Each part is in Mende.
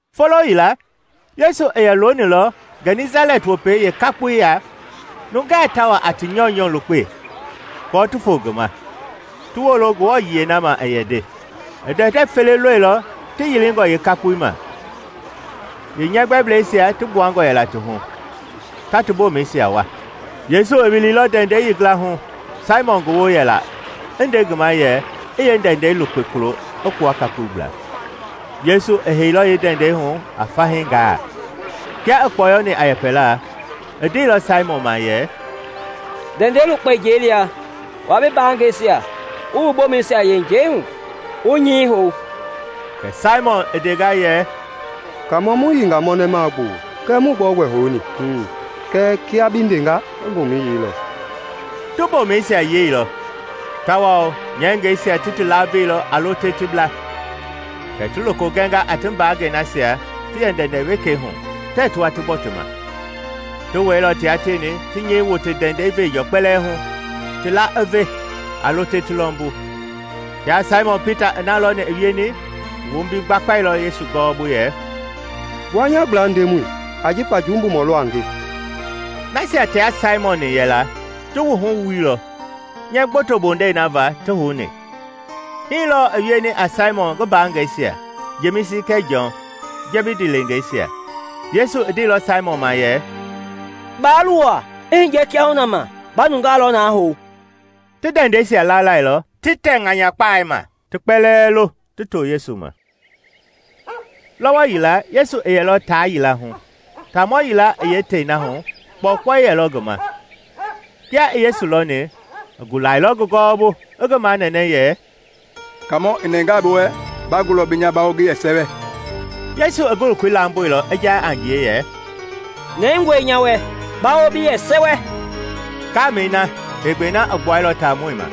Folo yila, Yesu i yɛ loonilɔ Gɛnisalɛt Wopei yeekakpoi ya, nungaa ta wa a ti nyɔunyɔ lukpe aako ti foo ngi ma, ti wolo Ngewɔ yiɛi na ma i yɛ nde. I ndɛndɛ fele lɔilɔ ti yilingɔ yeekakpoi ma; yeenyɛgbɛblɛisia ti gbuangɔ yɛla ti hu, ta ti boomɛisia wua. Yesu i wiliilɔ ndɛndɛi yeengila hu Saimɔn ngi woo yɛla i nde ngi ma yɛ i yeendɛndɛi lukpe kulo i gbua kakpoi gbla. Yesu i heilɔ yeendɛndɛi hu a fahii gaa. Kia i kpɔyɔni a yɛpɛla, i ndeilɔ Saimɔn ma yɛ, “Ndɛndɛi lukpe njɛi lia, wua bi mbaangɛisia wu wu boomɛisia yei njɛi hu, wu nyɛi hou.” Kɛ Saimɔn i ndenga yɛ, “Kaamɔ mu yiinga mɔnɛmaa gbuu kɛɛ muii gbɛogbɛ houni. Kɛɛ kia bi ndenga, nga mboomɛi yeilɔ.” Ti mbomɛisia yeilɔ tawao nyɛngɛisia ti ti laveilɔ a lo te ti bla. Kɛ ti loko gɛnga a ti mbangɛi nasia ti yɛ ndɛndɛ wekei hu tɛɛ ti wa ti gbɔ ti ma. Ti wɛilɔ tia tieni ti nyɛi wote ndɛndɛi veenjɔ kpɛlɛɛ hu, ti la i ve a lo te ti lɔmbu. Kia Saimɔn Pita i na lɔni i wieni, i wombi gbakpailɔ Yesu gɔwɔbu yɛ, “Gbua nya gbla, Ndemɔi, ajifa jumbumɔ lɔ a nge!” Nasia tia Saimɔn-ni yɛla ti wuhu i wuilɔ nyɛɛ gboto bondei na va ti houni. Hii lɔɔ i wieni a Saimɔn ngi mbaangɛisia, Jemisi kɛɛ Jɔn, Jɛbidi leengeisia. Yesu i ndeilɔ Saimɔn ma yɛ, “Baa luwa; i hiye kiahuna ma, ba nungaa lɔ na hou.” Ti ndɛndɛisia lalailɔ ti tɛ ŋanyakpai ma, ti kpɛlɛɛ lo ti too Yesu ma. Lɔwɔ yila Yesu i yɛlɔ taa yila hu, taamɔ yila i yeetei na hu kpɔukpɔui yelɔ ngi ma. Kia i Yesu lɔni, i gulailɔ ngi gɔwɔbu i ngi manɛnɛ yɛ, “Kaamɔ, i nɛngaa bi wɛ, ba gulɔ bi nya bawo ngi yɛ sɛwɛ!” Yesu i ngi lokoi lamboilɔ i ja a ngie yɛ, “Nɛngɔe nya wɛ, bawo bi yɛ sɛwɛ!” Ngamɛi na heegbɛi na i gbuailɔ taamɔi ma.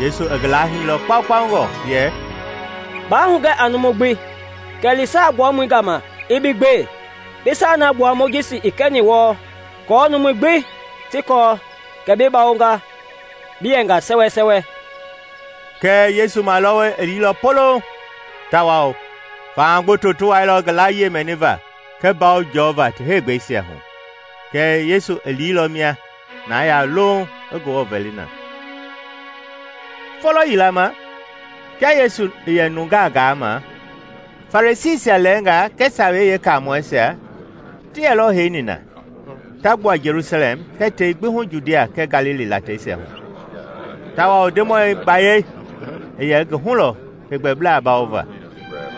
Yesu i ngi lahiilɔ kpaukpaungɔ yɛ, “Baa hugɛ a numu gbi, kɛɛ li saa gbuamɔi gama i bi gbe; bi saa na gbua Mojisi i kɛni wɔɔ aako numui gbi ti kɔɔ kɛ bi bawonga bi yɛnga sɛwɛsɛwɛ.” Kɛɛ Yesu malɔwɔi i liilɔ poloŋ tawao faha gboto ti wailɔ ngi layie mɛniva kɛɛ mbawo jɔva ti heegbɛisia hu. Kɛɛ Yesu i liilɔ mia na ya louŋ i Ngewɔ vɛli na. Folo yila ma, kia Yesu i yɛ nungaa gaama, Farisiisia lɛɛnga kɛɛ Sawei Yeekaamɔisia ti yɛlɔ heini na, ta gbua Jelusalɛm kɛɛ tei gbi hu Judia kɛɛ Galili lateisia hu; tawao Ndemɔi gbayei i ye ngi hu lɔ heegbɛbla bawova.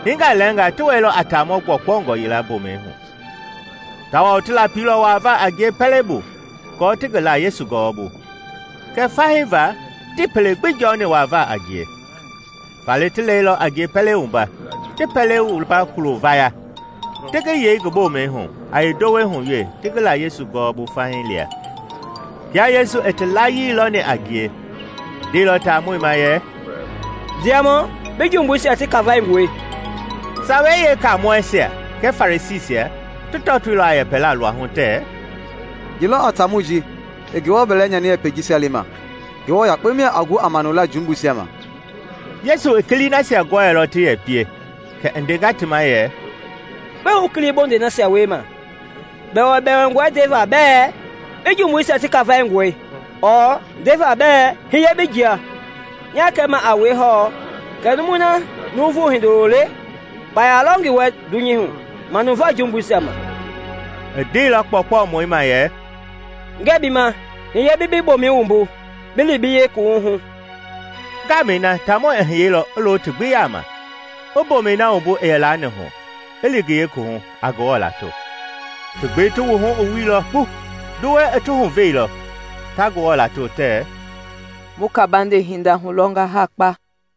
Hinga lɛɛnga ti wɛilɔ a taamɔ gbɔkpɔngɔ yila mboomɛi hu, tawao ti lapilɔ wuavaa a ngie pɛlei bu aako ti ngi la Yesu gɔwɔbu. Kɛɛ fahii va, tii pele gbi jɔni wuavaa a ngie. Faale ti lɛilɔ a ngie pɛlei wumba, ti pɛlei wumba kulo vaya, ti ngi yei ngi boomɛi hu a yeendowei hu wee ti ngi la Yesu gɔwɔbu fahii lia. Kia Yesu i ti layii lɔni a ngie, i ndeilɔ taamɔi ma yɛ, “Ndiamɔ, bi jumbuisia ti kafaingɔe.” Sawei Yeekamɔɛisia kɛɛ Farisiisia ti tɔtoilɔ a yɛpɛla luahu tɛɛ, “Ye lɔ a taamɔi ji i Ngewɔ bɛlɛ nyani yɛpɛi jisia lema? Ngewɔ yakpe mia a gu a manula jumbuisia ma!” Yesu i kilii nasia gɔɛilɔ ti yɛ pie kɛ i ndenga ti ma yɛ, “Gbɛe wu kili bondei nasia wiema? Bɛwɛbɛwɛngɔe ndeva bɛɛ ‘Bi jumbuisia ti kafaingɔe’ ɔɔ ndeva bɛɛ ‘Hiye bi jia’? Nya kɛma a wue hɔɔ kɛ numui na Nuuvu Hindoloi le, kpaya lɔ ngi wɛ dunyei hu manuva jumbuisia ma.” I ndeilɔ kpɔɔkpɔmɔi ma yɛ, “Ngɛɛ bi ma, hiye bi bi boomɛi wumbu bi li bi yeekuwuhu!” Ngamɛi na taamɔi i hiyeilɔ i lo ti gbi yama, i mboomɛi na wumbu i yɛ laani hu, i li ngi yeekuwuhu, a Ngewɔ lato. Ti gbi ti wuhu i wuilɔ kpu! Nduwɛi i ti huveilɔ, ta Ngewɔ lato tɛɛ, “Mu kabande hindangaa hulɔnga ha kpa!”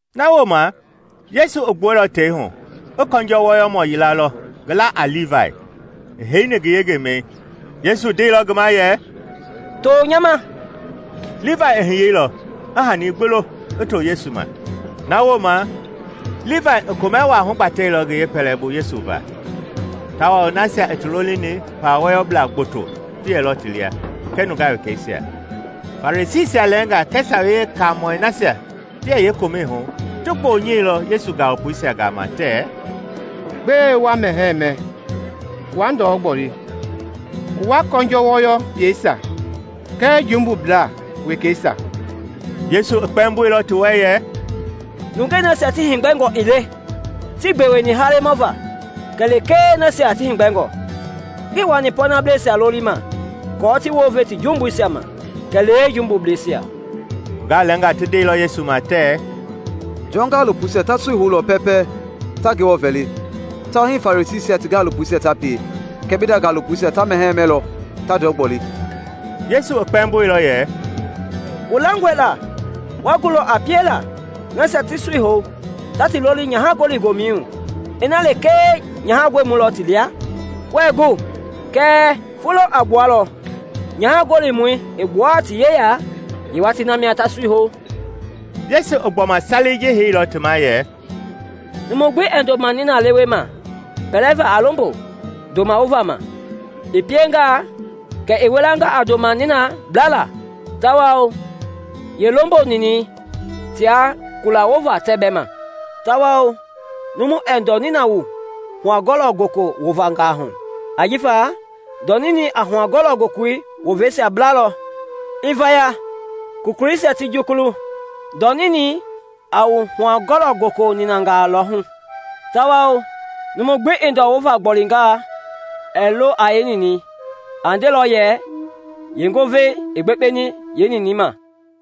Na wooma Yesu i gbuɛilɔ tei hu, i kɔnjɔ wɔyɔmɔ yila lɔ, ngi la a Livai, i heini ngi yengemɛi. Yesu ndeilɔ ngi ma yɛ, “To nya ma.” Livai i hiyeilɔ, i hani gbi lo, i to Yesu ma. Na wooma Livai i komɛ wa hugbatɛilɔ ngi yeepɛlɛbu Yesu va, tawao nasia i ti lolini pawa wɔyɔblaa gboto ti yɛlɔ ti lia kɛɛ nungaa wekeisia. Farisiisia lɛɛnga kɛɛ Sawei Yeekaamɔi nasia ti yɛ yeekomɛi hu ti gbonyɛilɔ Yesu gaalopoisia gama tɛɛ, “Gbɛe wa mɛhɛɛ mɛ wa ndɔ gboli wua kɔnjɔ wɔyɔblɛisia kɛɛ jumbubla wekeisia?” Yesu i kpɛmboilɔ ti wɛ yɛ, “Nungei nasia ti heegbɛngɔ ii le tii gbeweni halemɔ va kɛlee lekee nasia ti heegbɛngɔ. Ngii wani pɔɔnableisia lolima kɔɔ ti wounve ti jumbuisia ma, kɛlee jumbubleisia.” Nungaa lɛɛnga ti ndeilɔ Yesu ma tɛɛ, “Jɔn gaalopoisia ta sui houlɔ pɛɛpɛ ta Ngewɔ vɛli, tawao hii Farisiisia ti gaalopoisia ta pie; kɛɛ bi nda gaalopoisia ta mɛhɛɛ mɛlɔ ta ndɔ gboli.” Yesu i kpɛmboilɔ yɛ, “Wu langɔe la wa gulɔ a piela nasia ti sui hou ta ti loli nyaha-gɔli-gomɛi hu ina lekee nyaha- gɔlimɔi lɔ ti lia? Wɛɛ ngu! Kɛɛ foloi a gbualɔ nyaha gɔlimɔi i gbua ti yeya; yeewatii mia ta sui hou.” Yesu i gbɔma salei ji heilɔ ti ma yɛ, “Numu gbi ɛɛ ndoma nina lewe ma pɛlɛva a lombo ndoma wova ma. I piengaa, kɛ i wilanga a ndoma ninɛi blala, tawao yeelombo ninɛi tia kula wovei tɛɛ bɛ ma. Tawao numu ɛɛ ndɔ nina wu huakɔlɔ-goko wovangaa hu, ajifa ndɔ ninɛi a huakɔlɔ-goko woveisia blalɔ, i vaya, kokoisia ti jukulu. Ndɔ ninɛi a wu huakɔlɔ-goko ninanga lɔ hu! Tawao numu gbi i ndɔ wovei gbolinga, ɛɛ lo a yeeninɛi. A ndelɔ yɛ, ‘Yeengovei i gbekpeni yeeninɛi ma.’”